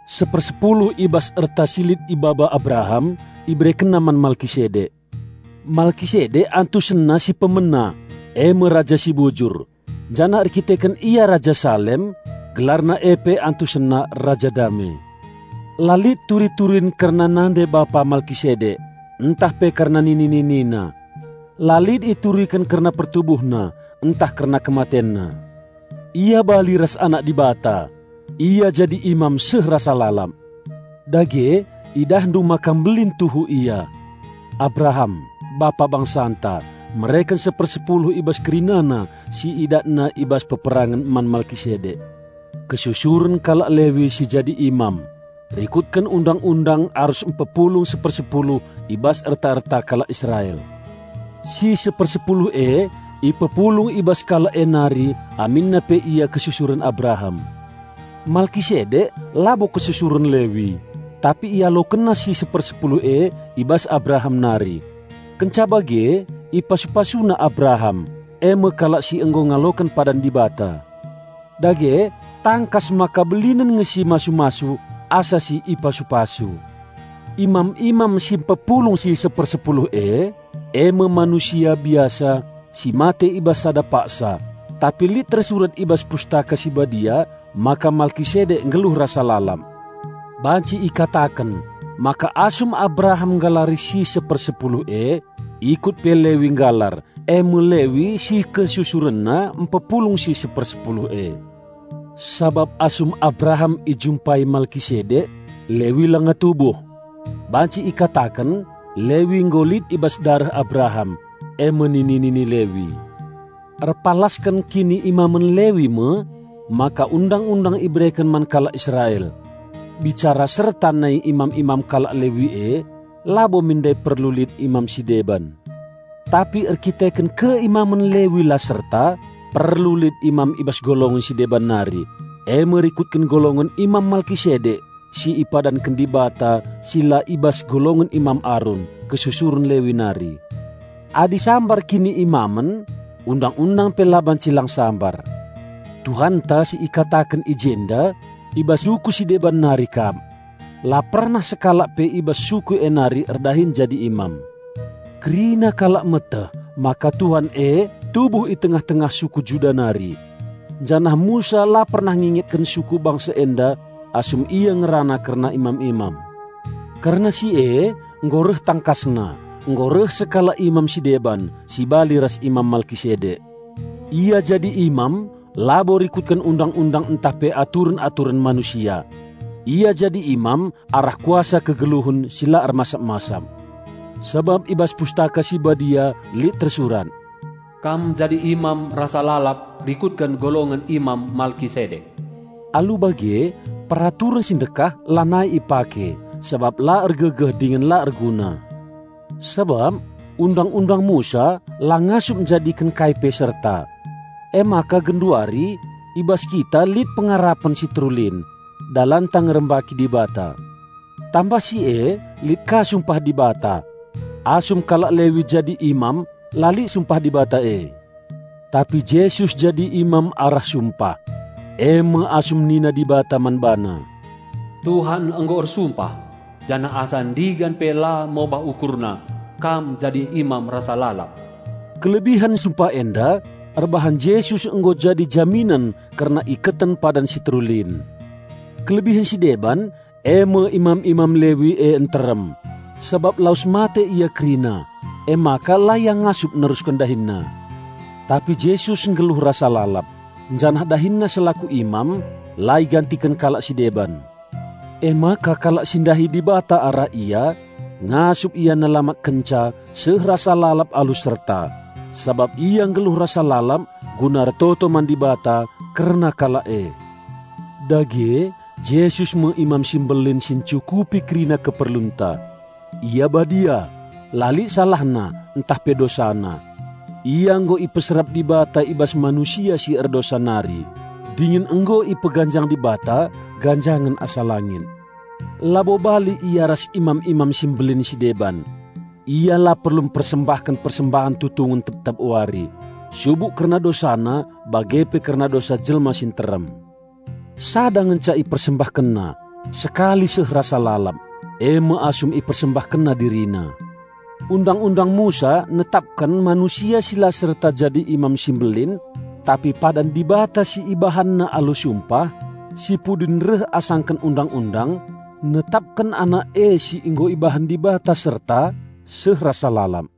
Sepersepuluh i bas erta si lit ibaba Abraham, iberekenna man Malkisedek. (Malkisedek antusenna si pemena e me, "Raja si Bujur" janah erdandanken ia Raja Salem, gelarna e pe antusenna "Raja Dame".) La lit turi-turin kerna nande-bapa Malkisedek ntah pe kerna nini-ninina. La lit ituriken kerna pertubuhna ntah kerna kematenna. Ia bali ras Anak Dibata; ia jadi imam seh rasa lalap. Dage idahndu maka mbelin tuhu ia! Abraham, bapa bangsanta, mereken sepersepuluh i bas kerinana si idatna i bas peperangen man Malkisedek. Kesusuren kalak Lewi si jadi imam, rikutken Undang-undang arus mpepulung sepersepuluh i bas erta-erta kalak Israel. Si sepersepuluh e ipepulung i bas kalak e nari aminna pe ia kesusuren Abraham. Malkisedek labo kesusuren Lewi, tapi ialokenna si sepersepuluh e i bas Abraham nari, kenca bage ipasu-pasuna Abraham, e me kalak si nggo ngaloken padan Dibata. Dage tangkas maka belinen nge si masu-masu asa si ipasu-pasu. Imam-imam si mpepulung si sepersepuluh e, e me manusia biasa si mate i bas sada paksa, tapi lit tersurat i bas Pustaka Si Badia maka Malkisedek nggeluh rasa lalap. Banci ikataken maka asum Abraham nggalari si sepersepuluh e, ikut pe Lewi nggalar (e me Lewi si kesusurenna mpepulung si sepersepuluh e). Sabap asum Abraham ijumpai Malkisedek, Lewi langa tubuh. Banci ikataken Lewi nggo lit i bas dareh Abraham, e me nini-nini Lewi. Erpalasken kiniimamen Lewi me maka Undang-undang ibereken man kalak Israel. Bicara serta nai imam-imam kalak Lewi e, labo min ndai perlu lit imam si deban. Tapi erkiteken keimamen Lewi la serta, perlu lit imam i bas golongen si deban nari, e me rikutken golongen Imam Malkisedek si ipadanken Dibata si la i bas golongen Imam Arun, kesusuren Lewi nari. Adi sambar kiniimamen, Undang-undang pe la banci lang sambar. Tuhanta si ikataken i jenda, i bas suku si deban nari kap. La pernah sekalak pe i bas suku e nari erdahin jadi imam. Kerina kalak meteh maka Tuhan e tubuh i tengah-tengah suku Juda nari. Janah Musa la pernah ngingetken suku bangsa enda asum ia ngerana kerna imam-imam. Kerna si e nggo reh tangkasna, nggo reh sekalak imam si deban, si bali ras Imam Malkisedek. Ia jadi imam labo rikutken Undang-undang ntah pe aturen-aturen manusia. Ia jadi imam arah kuasa kegeluhen si la ermasap-masap. Sabap i bas Pustaka Si Badia lit tersurat, "Kam jadi imam rasa lalap rikutken golongen Imam Malkisedek." Alu bage, peraturen si ndekah lanai ipake, sabap la ergegeh dingen la erguna. Sabap Undang-undang Musa la ngasup njadiken kai pe serta. Emaka genduari i bas kita lit pengarapen si terulin, dalanta ngerembaki Dibata. Tambah si e lit ka sumpah Dibata. Asum kalak Lewi jadi imam la lit sumpah Dibata e. Tapi Jesus jadi imam arah sumpah; e me asum nina Dibata man BaNa, "Tuhan nggo ersumpah, janah asa ndigan pe la mobah UkurNa, 'Kam jadi imam rasa lalap.'" Kelebihen sumpah enda erbahan Jesus nggo jadi jaminen kerna iketen padan si terulin. Kelebihen si deban eme imam-imam Lewi e nterem, sabap lawes mate ia kerina, emaka la ia ngasup nerusken dahinna. Tapi Jesus nggeluh rasa lalap, janah DahinNa selaku imam la igantiken kalak si deban. Emaka kalak si ndahi Dibata arah Ia, ngasup Ia nelamatkenca seh rasa lalap alu serta, sabap Ia nggeluh rasa lalap guna ertoto man Dibata kerna kalak e. Dage Jesus me Imam Simbelin si ncukupi kerina keperlunta. Ia badia; la lit SalahNa ntah pe DosaNa. Ia nggo ipeserap Dibata i bas manusia si erdosa nari, dingen nggo ipeganjang Dibata ganjangen asa langit. Labo bali Ia ras Imam-imam si Mbelin si deban. Ia la perlu mpersembahken persembahen tutungen tep-tep wari, subuk kerna DosaNa bage pe kerna dosa jelma si nterem. Sada ngenca IpersembahkenNa, sekali seh rasa lalap, e me asum IpersembahkenNa DiriNa. Undang-undang Musa netapken manusia si la serta jadi Imam si Mbelin; tapi padan Dibata si IbahanNa alu sumpah, si pudin reh asangken Undang-undang, netapken Anak e si nggo ibahan Dibata serta seh rasa lalap.